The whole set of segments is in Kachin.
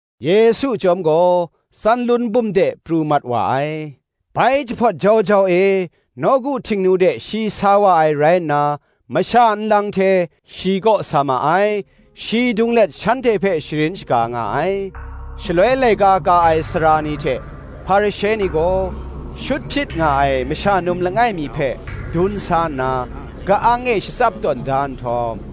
Yesu chyawm gaw Tsanlun bum de pru mat wa ai. Bai jahpawt jau jau e nawku Htingnu de shi sa wa ai rai nna, masha nlang hte shi kaw sa ma ai; shi dung let shanhte hpe sharin shaga nga ai. Shaloi laika ka ai sara ni hte Hparishe ni gaw, shut hpyit nga ai masha num langai mi hpe dun sa nna, ka-ang e shatsap tawn da nhtawm,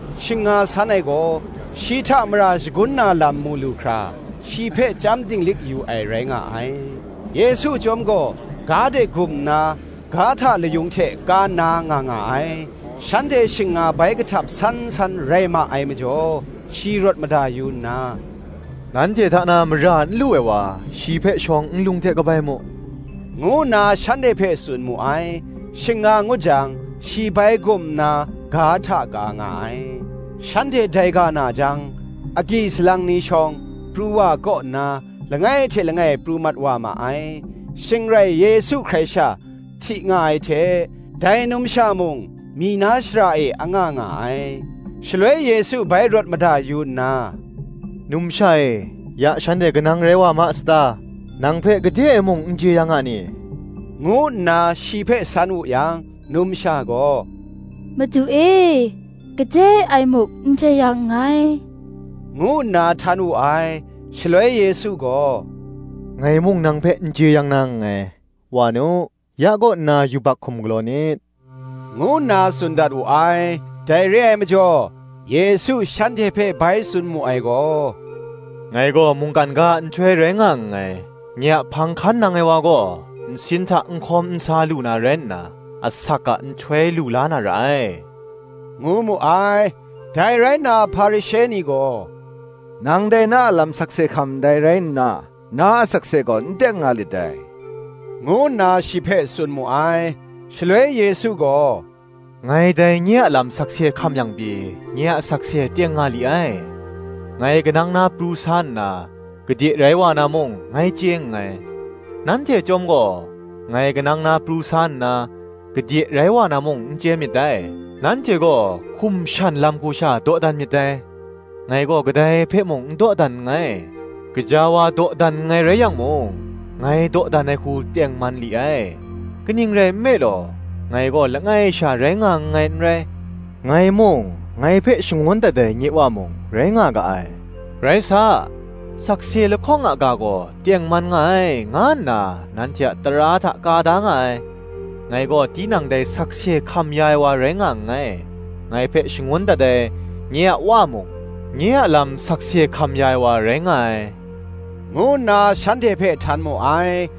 Shing nga san ai gaw, shi hta mara shagun na lam mu lu hkra, shi hpe chyam dinglik yu ai rai nga ai. Yesu chyawm gaw ga de gum nna, ga hta layung hte ka nna nga nga ai. Shanhte shing nga bai kahtap san san rai ma ai majaw, shi rawt mada yu nna, “Nanhte hta na mara n lu ai wa, shi hpe shawng nlung hte kabai mu,” ngu nna shanhte hpe tsun mu ai. Shing nga ngut jang shi bai gum nna, ga hta ka nga ai. Shanhte dai ga na jang, agyi salang ni shawng pru wa ai kaw nna, langai hte langai pru mat wa ma ai: shing rai Yesu hkrai sha hti nga ai hte, dai numsha mung myi na shara e anga nga ai. Shaloi Yesu bai rawt mada yu nna, “Numsha e, ya shanhte kanang rai wa ma sata? nang hpe gade e muk n jeyang a ni?” ngu nna shi hpe san wu yang, numsha gaw, “Madu e, gade e muk n jeyang nngai,” ngu nna htan wu ai. Shaloi Yesu gaw, Ngai mung nang hpe n jeyang na nngai: wa nu; ya kaw nna yubak hkum galaw nit, ngu nna tsun dat wu ai.] Dai re ai majaw Yesu shanhte hpe bai tsun mu ai gaw, “Ngai gaw mungkan ga a nhtoi rai nga nngai: nye a hpang hkan nang ai wa gaw, nsin hta n hkawm n sa lu na rai nna, asak a nhtoi lu la na ra ai,” ngu mu ai. Dai rai nna Hparishe ni gaw, “Nang dai na a lam sakse hkam ndai rai nna, na a sakse gaw n teng nga lit dai,” ngu nna shi hpe tsun mu ai. Shaloi Yesu gaw, “Ngai dai nye a lam sakse hkam yang pyi, nye a sakse teng nga li ai: ngai kanang na pru sa nna, gade rai wa na mung, ngai chye nngai: nanhte chyawm gaw, ngai kanang na pru sa nna, gade rai wa na mung n chye myit dai. Nanhte gaw hkum shan lam hku sha dawdan myit dai; ngai gaw kadai hpe mung n dawdan nngai. Gaja wa dawdan nngai rai yang mung, ngai dawdan ai hku tengman li ai: kaning rai nme law, ngai gaw langai sha rai nga nngai n rai; ngai mung, ngai hpe shangun dat ai, nye Wa mung, rai nga ga ai. Rai sa, sakse lahkawng a ga gaw tengman nga ai, nga nna nanhte a tara hta ka da nga ai. Ngai gaw tinang dai sakse hkam ya ai wa rai nga nngai: ngai hpe shangun dat ai, nye a Wa mung, nye a lam sakse hkam ya ai wa rai nga ai,” ngu nna shanhte hpe htan mu ai.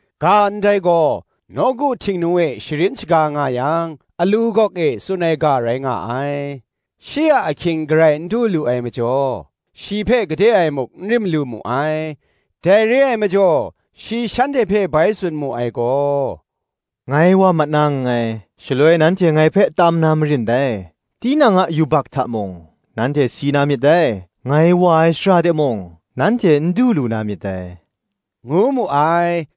Ga ndai gaw nawku Htingnu e sharin shaga nga yang, alu gawk e tsun ai ga rai nga ai: shi a ahkying garai n du lu ai majaw, shi hpe gade e muk n rim lu mu ai. Dai re ai majaw shi shanhte hpe bai tsun mu ai gaw, “Ngai wa mat na nngai, shaloi nanhte ngai hpe tam na marin dai; tinang a yubak hta mung, nanhte si na myit dai: ngai wa ai shara de mung, nanhte n du lu na myit dai,” ngu mu ai.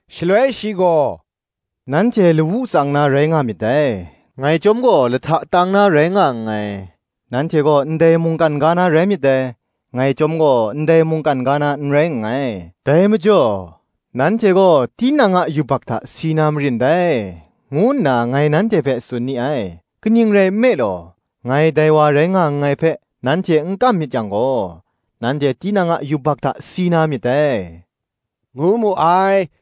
Shaloi shi gaw, “Nanhte lawu tsang na rai nga myit dai; ngai chyawm gaw lahta tang na rai nga nngai: nanhte gaw ndai mungkan ga na rai myit dai; ngai chyawm gaw ndai mungkan ga na n rai nngai. Dai majaw, nanhte gaw tinang a yubak hta si na marin dai, ngu nna ngai nanhte hpe tsun ni ai: kaning rai nme law, ngai dai wa rai nga nngai hpe, nanhte n kam myit yang gaw, nanhte tinang a yubak hta si na myit dai,” ngu mu ai.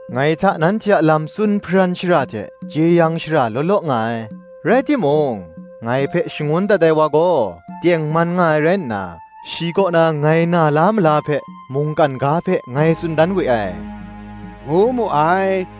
Ngai hta nanhte a lam tsun hparan shara hte jeyang shara law law nga ai: rai timung, ngai hpe shangun dat ai wa gaw, tengman nga ai rai nna, shi kaw na ngai na la mala hpe mungkan ga hpe ngai tsun dan we ai,” ngu mu ai.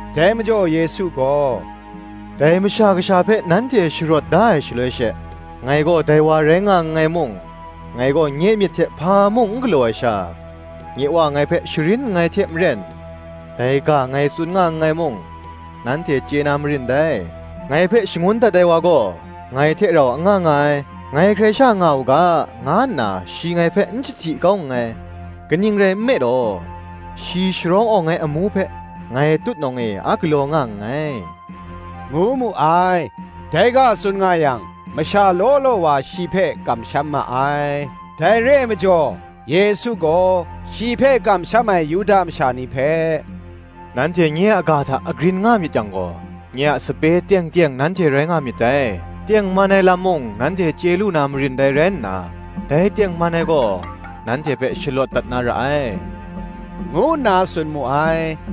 Dai majaw Yesu gaw, “Dai Masha Kasha hpe nanhte sharawt da ai shaloi she, ngai gaw dai wa rai nga nngai mung, ngai gaw nye myit hte hpa mung n galaw ai sha, nye Wa ngai hpe sharin nngai hte maren, dai ga ngai tsun nga nngai mung, nanhte chye na marin dai. Ngai hpe shangun dat ai wa gaw ngai hte rau anga nga ai; ngai hkrai sha nga u ga, nga nna shi ngai hpe n jahti kau nngai: kaning rai nme law, shi sharawng awng ai amu hpe, ngai tutnawng e a galaw nga nngai,” ngu mu ai. Dai ga tsun nga yang, masha law law wa shi hpe kamsham ma ai. Dai re ai majaw Yesu gaw shi hpe kamsham ai Yuda masha ni hpe, “Nanhte nye a ga hta agrin nga myit yang gaw, nye a sape teng teng nanhte rai nga myit dai: tengman ai lam mung nanhte chye lu na marin dai rai nna, dai tengman ai gaw, nanhte hpe shalawt dat na ra ai,” ngu nna tsun mu ai.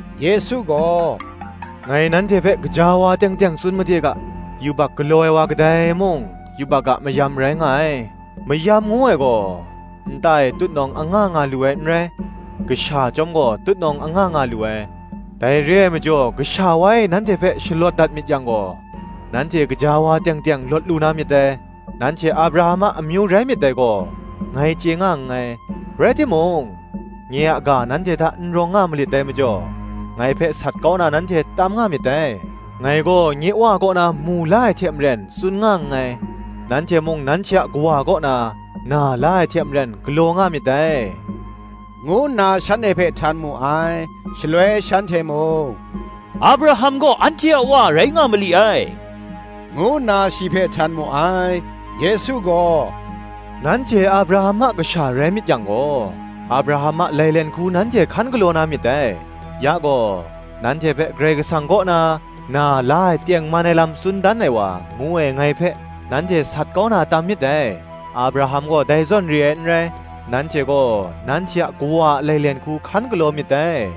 Yesu gaw, “Ngai nanhte hpe gaja wa teng teng tsun made ga, Yubak galaw ai wa kadai mung, yubak a mayam rai nga ai. Mayam ngu ai gaw, nta e tutnawng anga nga lu ai n rai: kasha chyawm gaw tutnawng anga nga lu ai. Dai re ai majaw Kasha wa e nanhte hpe shalawt dat myit yang gaw, nanhte gaja wa teng teng lawt lu na myit dai. Nanhte Abraham a amyu rai myit dai gaw, ngai chye nga nngai: rai timung, nye a ga nanhte hta n rawng nga malit dai majaw, ngai hpe sat kau na nanhte tam nga myit dai. Ngai gaw nye Wa kaw na mu la ai hte maren, tsun nga nngai: nanhte mung nanhte a kawa kaw na, na la ai hte maren, galaw nga myit dai,” ngu nna shanhte hpe htan mu ai. Shaloi shanhte mung, “Abraham gaw anhte a Wa rai nga mali ai,” ngu nna shi hpe htan mu ai. Yesu gaw, “Nanhte Abraham a kasha rai myit yang gaw, Abraham a lailen hku nanhte hkan galaw na myit dai. Ya gaw, nanhte hpe Karai Kasang kaw na, na la ai tengman ai lam tsun dan ai wa, ngu ai ngai hpe, nanhte sat kau na tam myit dai: Abraham gaw dai zawn re ai n rai. Nanhte gaw nanhte a kawa a lailen hku hkan galaw myit dai,”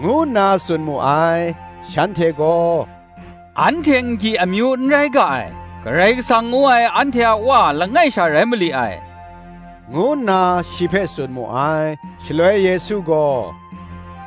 ngu nna tsun mu ai. Shanhte gaw, “Anhte n-gyi amyu n rai ga ai. Karai Kasang ngu ai anhte a Wa langai sha rai mali ai,” ngu nna, shi hpe tsun mu ai. Shaloi Yesu gaw,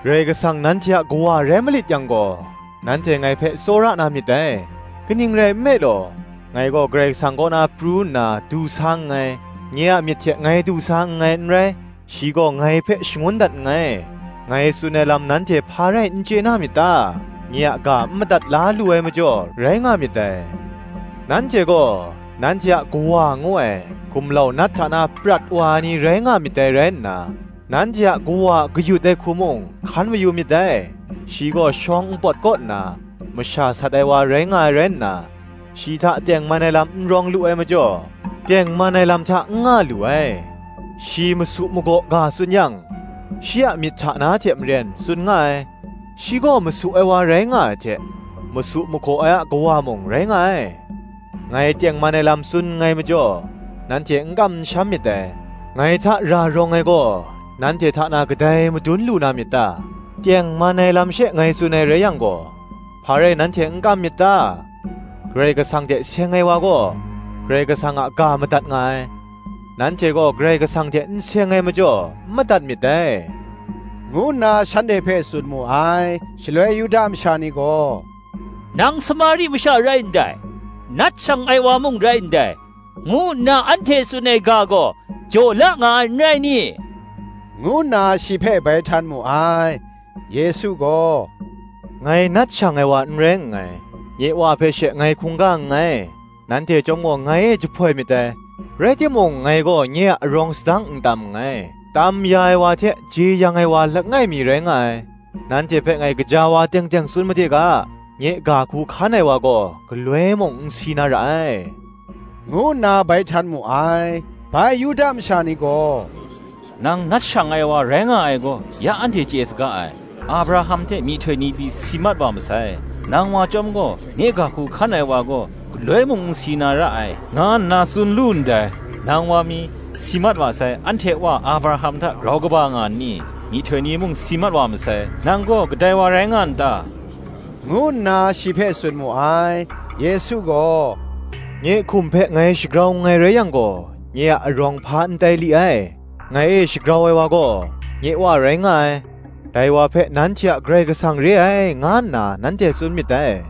“Karai Kasang nanhte a Kawa rai malit yang gaw, nanhte ngai hpe tsawra na myit dai: kaning rai nme law, ngai gaw Karai Kasang kaw na pru nna du sa nngai, nye a myit hte ngai du sa nngai n rai, shi gaw ngai hpe shangun dat nngai. Ngai tsun ai lam nanhte hpa rai n chye na myit ta? Nye a ga n madat la lu ai majaw, rai nga myit dai. Nanhte gaw, nanhte a kawa ngu ai, gumlau Nat hta na prat wa ai ni rai nga myit dai rai nna, nanhte a kawa a kayut ai hku mung, hkan mayu myit dai: shi gaw shawng npawt kaw nna, masha sat ai wa rai nga ai rai nna, shi hta tengman ai lam n rawng lu ai majaw, tengman ai lam hta n nga lu ai: shi masu magaw ga tsun yang, shi a myit hta na hte maren tsun nga ai: shi gaw masu ai wa rai nga ai hte, masu magaw ai a kawa mung, rai nga ai. Ngai tengman ai lam tsun nngai majaw, nanhte n kam n sham myit dai. Ngai hta ra rawng ai gaw, nanhte hta na kadai madun lu na myit ta? tengman ai lam she ngai tsun ai rai yang gaw, hpa rai nanhte n kam myit ta? Karai Kasang hte seng ai wa gaw, Karai Kasang a ga madat nga ai; nanhte gaw Karai Kasang hte n seng ai majaw, n madat myit dai,” ngu nna shanhte hpe tsun mu ai. Shaloi Yuda masha ni gaw, “Nang Samari masha rai ndai, nat shang ai wa mung rai ndai, ngu nna anhte tsun ai ga gaw, jaw la nga ai n rai ni?” ngu nna shi hpe bai htan mu ai. Yesu gaw, “Ngai nat shang ai wa n rai nngai: nye Wa hpe she ngai hkungga nngai, nanhte chyawm gaw ngai e jahpoi myit dai. Rai timung ngai gaw nye a arawng sadang n tam nngai; tam ya ai wa hte jeyang ya ai wa langai mi rai nga ai. Nanhte hpe ngai gaja wa teng teng tsun made ga, Nye ga hku hkan ai wa gaw galoi mung n si na ra ai,” ngu nna bai htan mu ai. Bai Yuda masha ni gaw, “Nang nat shang ai wa rai nga ai gaw, ya anhte chye saga ai: Abraham hte myihtoi ni pyi si mat wa masai; nang wa chyawm gaw, Nye ga hku hkan ai wa gaw, galoi mung n si na ra ai, nga nna tsun lu ndai. Nang wa mi, si mat wa sai, anhte a Wa Abraham hta grau kaba nga nni? myihtoi ni mung si mat wa masai; nang gaw kadai wa tai nga n ta?” ngu na shi hpe tsun mu ai. Yesu gaw, Nye “hkum hpe ngai shagrau nngai rai yang gaw, nye a arawng hpa n tai li ai; ngai e shagrau ai wa gaw, nye Wa rai nga ai: dai wa hpe nanhte a Karai Kasang re ai, nga nna nanhte tsun myit dai;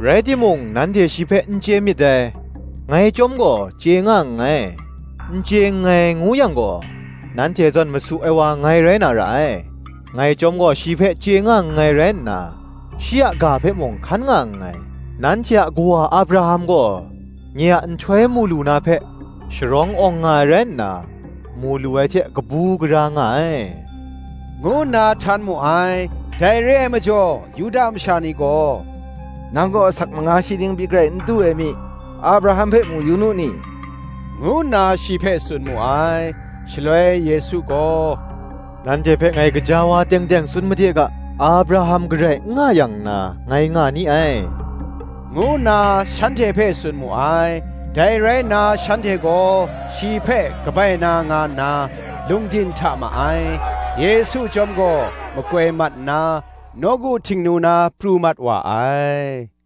rai timung nanhte shi hpe n chye myit dai, ngai chyawm gaw chye nga nngai. N chye nngai, ngu yang gaw, nanhte zawn masu ai wa ngai rai na ra ai: ngai chyawm gaw shi hpe chye nga nngai rai nna, shi a ga hpe mung hkan nga nngai. Nanhte a kawa Abraham gaw nye a nhtoi mu lu na hpe, sharawng awng nga ai rai nna, mu lu ai hte kabu gara nga ai,” ngu nna htan mu ai. Dai re ai majaw Yuda masha ni gaw, “Nang gaw asak manga shi ning pyi garai n du ai mi, Abraham hpe mu yu nu ni?” ngu nna shi hpe tsun mu ai. Shaloi Yesu gaw, “Nanhte hpe ngai gaja wa teng teng tsun made ga, Abraham garai n nga yang nna ngai nga ni ai,” ngu nna shanhte hpe tsun mu ai. Dai rai nna shanhte gaw shi hpe kabai na nga nna, lungdin hta ma ai: Yesu chyawm gaw makoi mat nna, nawku Htingnu na pru mat wa ai.